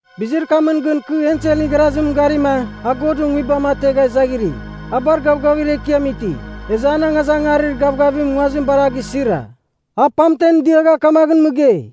Bizir kamɨn gɨn kɨ enselɨn igharazimɨn garima a Godɨn Nguibam ategha izaghiri. A bar gavgavir ekiam iti, ezɨ an angazangarir gavgavim nguazim bar a gisira. A pamten diagha kamaghɨn mɨgei,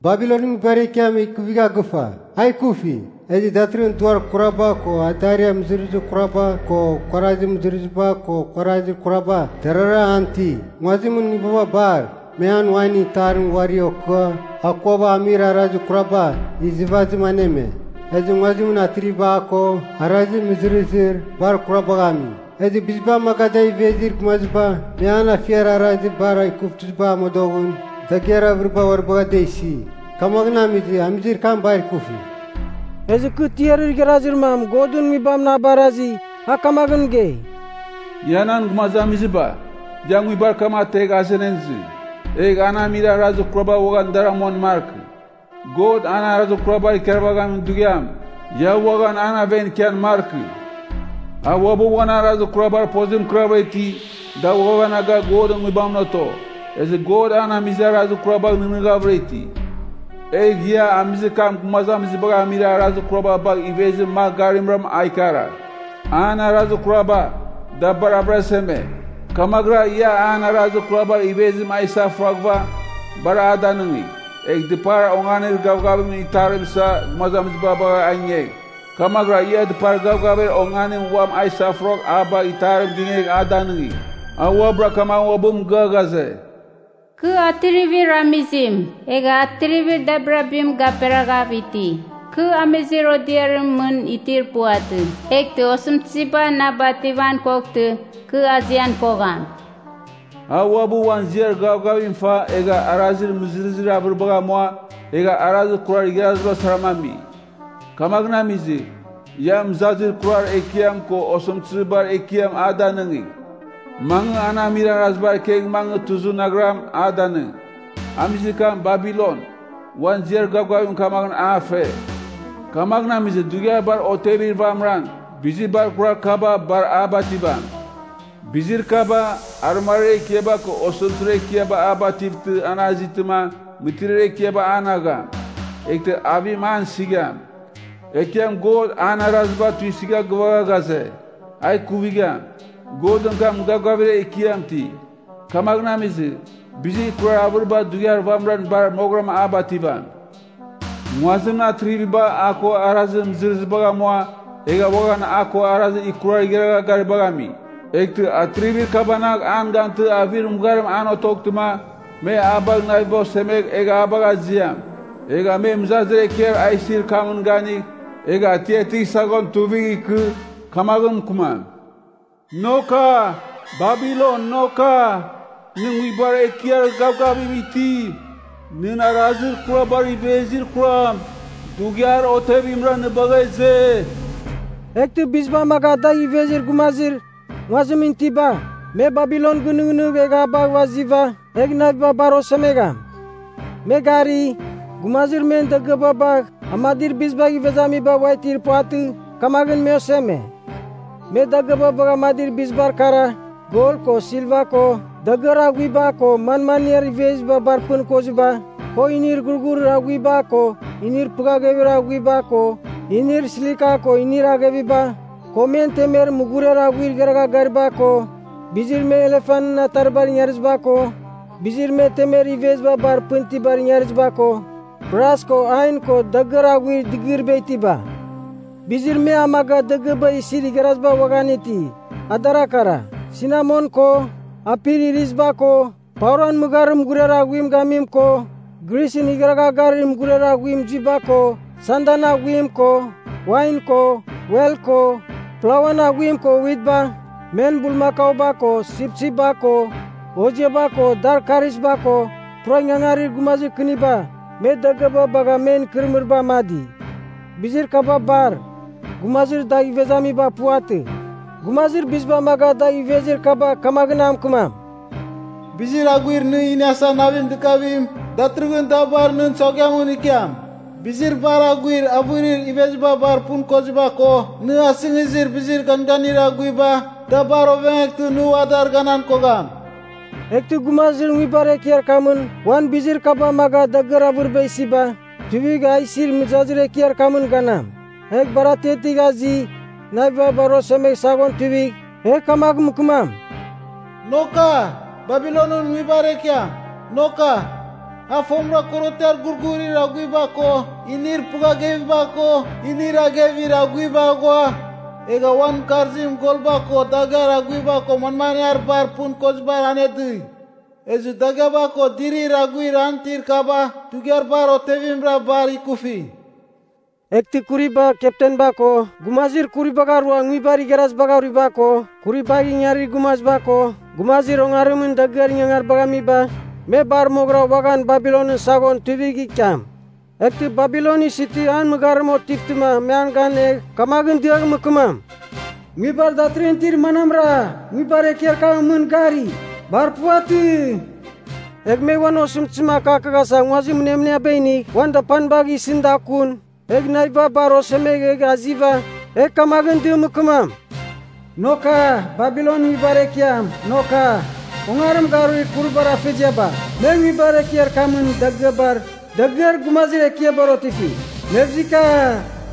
“Babilonɨn nguibar ekiam ikuvigha gɨfa! A ikufi! Ezɨ datɨrɨghɨn duar kuraba ko adariar mɨzɨrɨzir kuraba ko kuarazir mɨzɨrɨziba ko kuarazir kuraba, darara an iti. Nguazimɨn nguibaba bar, me an wainɨn itarim uari okɨa akuava amir arazir kuraba izɨvazim aneme. Ezɨ nguazimɨn atriviba a ko arazir mɨzɨrɨzir bar kurabagh ami. Ezɨ biziba amaga dagh ivezir gumaziba, me an afiar arazir bar ikuvtɨzibar amodoghɨn dagɨar avɨriba uari bagha da isi. Kamaghɨn amizɨ, amizir kam bar ikufi.” Ezɨ kɨ tiarir igharazir mam Godɨn Nguibamɨn a barazi, a kamaghɨn mɨgei, “Ia nan gumazamiziba, ia nguibar kam ategh azenan izɨ. Egh an amir arazir kuraba uaghan dar amuan markɨ. God an arazir kurabar ikarvaghamin dughiam, ia uaghan an aven ikian markɨ! A uabɨ uan arazir kurabar pozim mɨkɨrav iti, da ghuavanaga Godɨn Nguibamɨn oto. Ezɨ God an amizir arazir kurabagh nɨghnɨghavɨra iti. Egh ia amizir kam gumazamizibagh amizir arazir kuraba bagh ivezir magh garimra a ikaragh. An arazir kuraba, da bar avɨraseme, kamaghɨra ia an arazir kurabar ivezim a isafuraghɨva bar a danɨngigh. Egh dɨpar onganir gavgavimɨn itarim isa a gumazamiziba bagha a ingegh, kamaghɨra ia dɨpar gavgavir onganim uam a isafuragh a bagh itarim ginegh a danɨngigh. A uabɨra kamagh uabɨn mɨgɨa ghaze, ‘Kɨ atrivir amizim, egha atrivir dabirabim gaperaghav iti. Kɨ amizir odiarimɨn mɨn itir puvatɨ, eghtɨ osɨmtɨziba na bativan koghtɨ, kɨ azian kogham!’ A uabɨ uan ziar gavgavim fa egha arazir mɨzɨrɨzir avɨribagh amua, egha arazir kurar igharaziba saram ami. Kamaghɨn amizɨ, ia mɨzazir kurar ekiam ko osɨmtɨzir bar ekiam a danɨngigh, mangɨ an amir arazibar ikegh mangɨ tuzɨ naghram, a danɨng. Amizir kam Babilon, uan ziar gavgavim kamaghɨn a fe, kamaghɨn amizɨ dughiar bar otevir vamɨran, bizir bar kuraba bar a bativam. Bizir kaba, arɨmariar ekiaba ko osɨmtɨzir ekiaba a bativtɨ an azitɨma, mɨtiriar ekiaba an agham. Eghtɨ avim an isigham. Ekiam God an araziba tuisɨgha gɨvagha ghaze, ‘A ikuvigham.’ Godɨn kam gavgavir ekiam iti. Kamagh amizɨ, bizir ikurar avɨriba dughiar vamɨra bar moghɨram a bativam.” “Nguazimɨn atriviba a ko arazir mɨzɨrɨzibagh amua, egha uaghan a ko arazir ikurar igharagha garibagh ami. Eghtɨ atrivir kabanagh an gantɨ avir mɨgharim an otoghtɨma, me a bagh naviba osemegh egh a bagh aziam. Egha me mɨzazir ekiar a isir kamɨn ganigh, egh atiatigh saghon tuivigh ikɨ, kamaghɨn mɨkɨmam, ‘Noka, Babilon noka, nɨ nguibar ekiar gavgavim itim! Nɨn arazir kurabar ivezir kuram dughiar otevimra nɨ bagha ize.’ “Eghtɨ biziba amaga dagh ivezir gumazir nguazimɨn itiba, me Babilon gɨnɨghnɨgh egh a bagh aziva, egh naviba bar osemegham. Me gari, gumazir men dagɨaba bagh amadir bizibagh ivezamiba ua itir puvatɨ, kamaghɨn me oseme. Me dagɨaba bagha amadir bizibar kara, gol ko silva ko, dagɨar aghuiba ko manmaniar iveziba bar pɨn koziba; ko inir ghurghurir aghuiba ko inir pɨghaghevir aghuiba ko inir slika ko inir agheviba, ko men temer mughuriar aghuir igharagha gariba ko bizir me elefanɨn ataribar ingariziba ko, bizir me temer iveziba bar pɨn itibar ingariziba ko, bras ko ain ko, dagɨar aghuir dɨgɨriba itiba. Bizir me amaga dagɨaba isir igharaziba uaghan iti, adar kara, sinamon ko, apir iriziba ko, pauran mɨgharir mughuriar aghuim gamim ko, grisɨn igharagha garir mughuriar aghuim zuiba ko, sandan aghuim ko, wain ko, wel ko, plauan aghuim ko witba; men bulmakauba ko, sipsipba ko hoziaba ko dar karisba ko, pura ingangarir gumazir kɨniba—me dagɨaba bagha men ikɨrɨmɨriba amadi. Bizir kaba bar, gumazir dagh ivezamiba puvatɨ. “Gumazir biziba amaga dagh ivezir kaba kamaghɨn a mɨkɨmam, ‘Bizir aghuir nɨ iniasa navim dɨkavim, datɨrɨghɨn da bar nɨn saghuiamɨn ikiam. Bizir bar aghuir avɨrir iveziba bar pɨn koziba ko nɨ asɨngizir bizir ganganir aghuiba, da bar ovengeghtɨ nɨ ua dar ganan kogham!’ Eghtɨ gumazir nguibar ekiar kamɨn uan bizir kaba amaga dagɨar avɨriba isiba, tuivigh a isir mɨzazir ekiar kamɨn ganam. Egh bar atiatigh azi, naviba bar osemegh saghon tuivigh, egh kamagh mɨkɨmam, ‘Noka, Babilonɨn nguibar ekiam. Noka! A fomɨra korotiar ghurghurir aghuiba ko inir pɨghagheviba ko inir aghevir aghuiba aghua, egha uan mɨkarzim golba ko dagɨar aghuiba ko manmaniar bar pɨn kozibar anedɨi! Ezɨ dagɨaba ko dirir aghuir an itir kaba dughiar bar otevimra bar ikufi!’ “Eghtɨ kuribar keptenba ko, gumazir kuribagh arua nguibar igharazibagh aruiba ko, kuribar ingangarir gumaziba ko gumazir ongarimɨn dagɨar ingangaribagh amiba, me bar moghɨra uaghan Babilonɨn saghon tuivigh ikiam. Eghtɨ Babilon isitɨ an mɨgharim otivtɨma me an gan egh, kamaghɨn diagh mɨkɨmam, ‘Nguibar datɨrɨghɨn itir manamra, nguibar ekiar kamɨn mɨn gari? Bar puvatɨ!’ Egh me uan osɨmtɨzim akaghasa nguazir mɨnemɨniaba inigh uan dapanibagh isɨn da kun, egh naviba bar osemegh egh aziva, egh kamaghɨn dɨm mɨkɨmam, ‘Noka, Babilonɨn nguibar ekiam, noka! Ongarim garuir kuribar afeziaba, me nguibar ekiar kamɨn dagɨabar, dagɨar gumazir ekiabar otifi. Mevzika!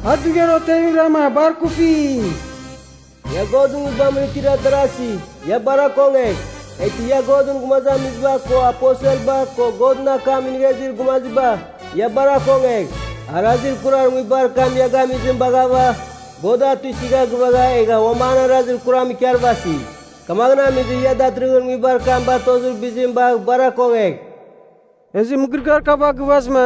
A dughiar otevimrama bar ikufi!’ ‘Ia Godɨn Nguibamɨn itir darasi, ia bar akongegh! Eghtɨ ia Godɨn gumazamiziba ko aposelba ko Godɨn akam inigha izir gumaziba, ia bar akongegh! Arazir kurar nguibar kam ia gamizim baghava, God a tuisɨgha gɨvagha, egha uam an arazir kuram ikarvasi. Kamaghɨn amizɨ ia datɨrɨghɨn nguibar kam batozir bizim bagh bar akongegh.’” Ezɨ mɨgɨrɨgɨar kaba gɨvazɨma,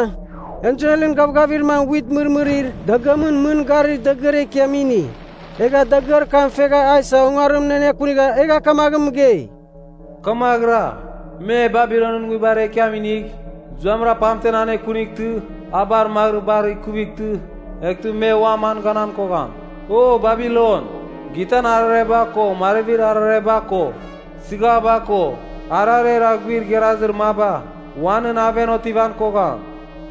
enselɨn gavgavir mam wit mɨrmɨrir dagɨamɨn mɨn garir dagɨar ekiam ini. Egha dagɨar kam fegha a isa ongarimɨn anekunigha egha kamaghɨn mɨgei, “Kamaghɨra, me Babilonɨn nguibar ekiam inigh zuamɨra pamtem anekunightɨ a bar magɨrɨgh bar ikuvightɨ, eghtɨ me uam a ganan kogham. O Babilon! Gitan arareba ko marvibar arareba ko, sɨghaba ko, ararer aghuir igharazir maba ua nɨn aven otivan kogham.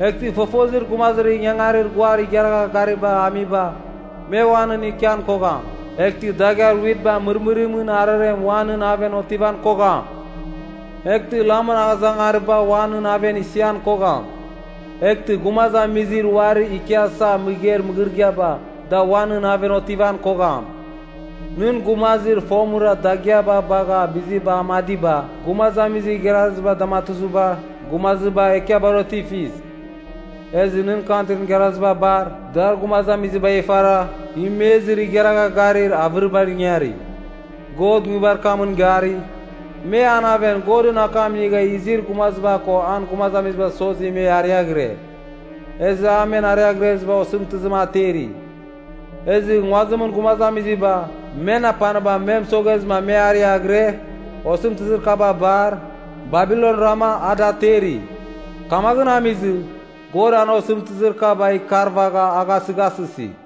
Eghtɨ fofozir gumazir ingangarir guar igharagha garibagh amiba, me ua nɨn ikian kogham! Eghtɨ dagɨar witba mɨrmɨrimɨn ararem ua nɨn aven otivan kogham! Eghtɨ lamɨn angazangariba ua nɨn aven isian kogham. Eghtɨ gumazamizir uarir ikiasa mɨgeir mɨgɨrɨgɨaba, da ua nɨn aven otivan kogham. Nɨn gumazir fomɨra dagɨaba bagha biziba amadiba, gumazamizir igharazibar damatuzibar gumazir bar ekiabar otifis. Ezɨ nɨ kantrin igharaziba bar dar gumazamizibagh ifara imezir igharagha garir avɨribar ingari. God nguibar kamɨn gari, me an aven Godɨn akam inigha izir gumaziba ko an gumazamizibav sozi me ariaghɨre, ezɨ a men ariaghrezibar osɨmtɨzim ateri. Ezɨ nguazimɨn gumazamiziba, men apaniba me mɨsoghezɨ me ariaghɨre, osɨmtɨzir kaba bar, Babilonrama a da ateri. Kamaghɨn amizɨ God an osɨmtɨzir kaba ikarvagha a gasɨghasɨsi.”